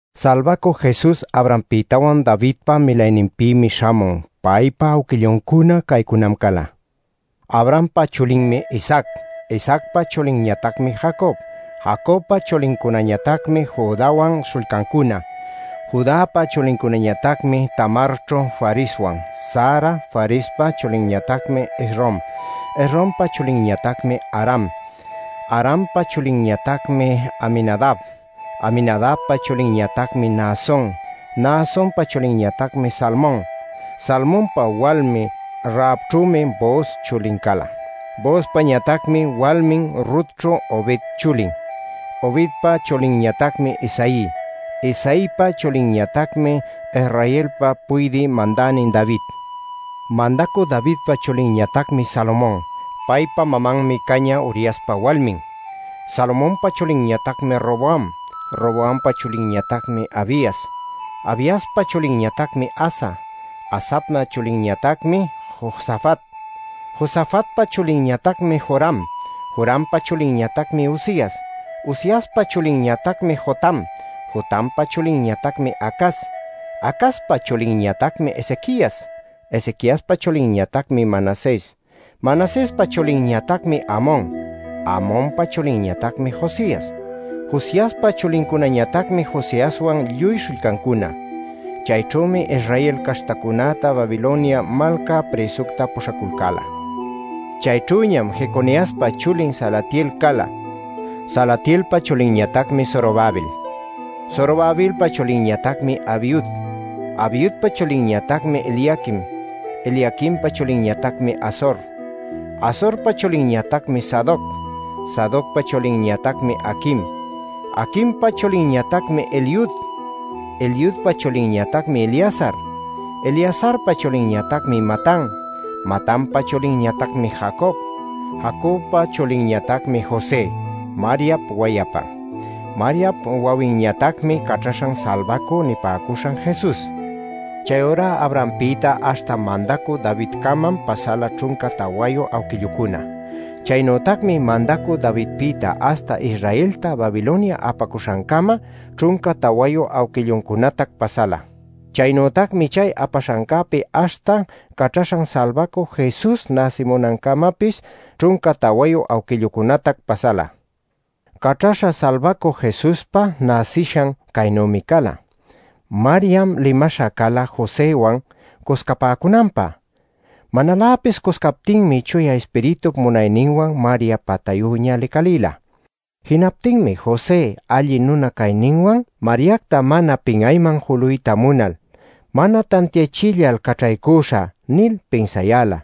Salbacü Jesus Abrahampïtawan Davidpa milayninpïmi śhamun. Paypa awquilluncuna caycunam cala: Abrahampa chulinmi Isaac. Isaacpa chulinñatacmi Jacob. Jacobpa chulincunañatacmi Judäwan śhullcancuna. Judäpa chulincunañatacmi Tamarćhu Fareswan, Zara. Farespa chulinñatacmi Esrom. Esrompa chulinñatacmi Aram. Arampa chulinñatacmi Aminadab. Aminadabpa chulinñatacmi Naason. Naasonpa chulinñatacmi Salmon. Salmonpa walmin Rahabćhümi Booz chulin cala; Boozpañatacmi walmin Rutćhu Obed chulin. Obedpa chulinñatacmi Isaí. Isaïpa chulinñatacmi Israelpa puydï mandänin David. Mandacü Davidpa chulinñatacmi Salomon. Paypa mamanmi cañä Uriaspa walmin. Salomonpa chulinñatacmi Roboam. Roboampa chulinñatacmi Abias. Abiaspa chulinñatacmi Asa. Asap chulinñatacmi Josafat. Josafatpa chulinñatacmi Joram. Jorampa chulinñatacmi Uzias. Uziaspa chulinñatacmi Jotam. Jotampa chulinñatacmi Acaz. Acazpa chulinñatacmi Ezequias. Ezequiaspa chulinñatacmi Manases. Manasespa chulinñatacmi Amon. Amonpa chulinñatacmi Josias. Josiaspa chulincunañatacmi Jeconiaswan lluy śhullcancuna. Chayćhümi Israel caśhtacunäta Babilonia malca prïsucta puśhaculcäla. Chayćhüñam Jeconiaspa chulin Salatiel cala. Salatielpa chulinñatacmi Zorobabel. Zorobabelpa chulinñatacmi Abiud. Abiudpa chulinñatacmi Eliaquim. Eliaquimpa chulinñatacmi Azor. Azorpa chulinñatacmi Sadoc. Sadocpa chulinñatacmi Aquim. Aquimpa chulinñatacmi Eliud. Eliudpa chulinñatacmi Eleazar. Eleazarpa chulinñatacmi Matan. Matanpa chulinñatacmi Jacob. Jacobpa chulinñatacmi José, Mariap wayapan. Mariap wawinñatacmi Caćhaśhan Salbacüca nipäcuśhan Jesus. Chayurá Abrahampïta aśhta mandacü Davidcamam pasala ćhunca tawayu awquillucuna. Chaynütacmi mandacü Davidpïta aśhta Israelta Babilonia apacuśhancama ćhunca tawayu awquilluncunatac pasala. Chaynütacmi chay apaśhancäpi aśhta Caćhaśhan Salbacü Jesus näsinancamapis ćhunca tawayu awquillucunatac pasala. Caćhaśha Salbacü Jesuspa näsishan caynümi cala: Mariam limaśha cala Joséwan cuscapäcunanpä. Manaläpis cuscayaptinmi Chuya Ispiritup munayninwan Maria patayüña licalila. Jinaptinmi José alli nuna cayninwan, Mariacta mana pin'ayman juluyta munal “Mana tantiachillal caćhaycüśhä” nil pinsayäla.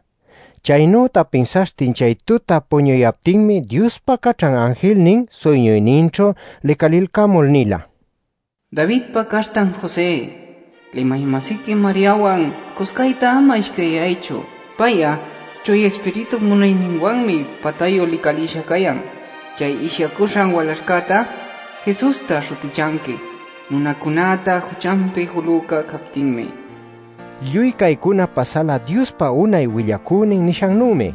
Chaynüta pinsaśhtin chay tuta puñuyaptinmi Diospa caćhan anjilnin suyñuyninćhu licalilcamul nila: “Davidpa caśhtan José, limay-masiqui Mariawan cuscayta ama ishcayyaychu. Pay'a Chuya Ispiritup munayninwanmi patayu licalïsha cayan. Chay ishyacuśhan walaśhcätá ‘Jesusta’ śhutichanqui, nunacunäta juchanpi julüca captinmi” nil. Lluy caycuna pasala Diospa unay willacünin nishannümi: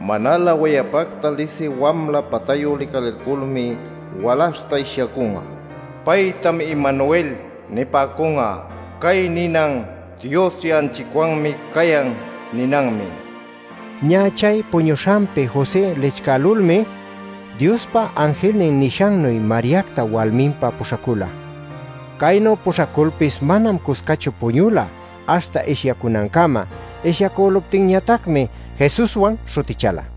“Manalä wayapacta lisï wamla patayu licalilculmi walaśhta ishyacun'a. Paytam ‘Emanuel’ nipäcun'a”. Cay ninan “Dios ya'anchicwanmi cayan” ninanmi. Ñä chay puñuśhancäpi José lichcälulmi Diospa anjilnin nishannuy Mariacta walminpä puśhacula. Caynu puśhaculpis manam cuscachu puñula, aśhta ishyacunancama. Ishyacüluptinñatacmi “Jesuswan” śhutichäla.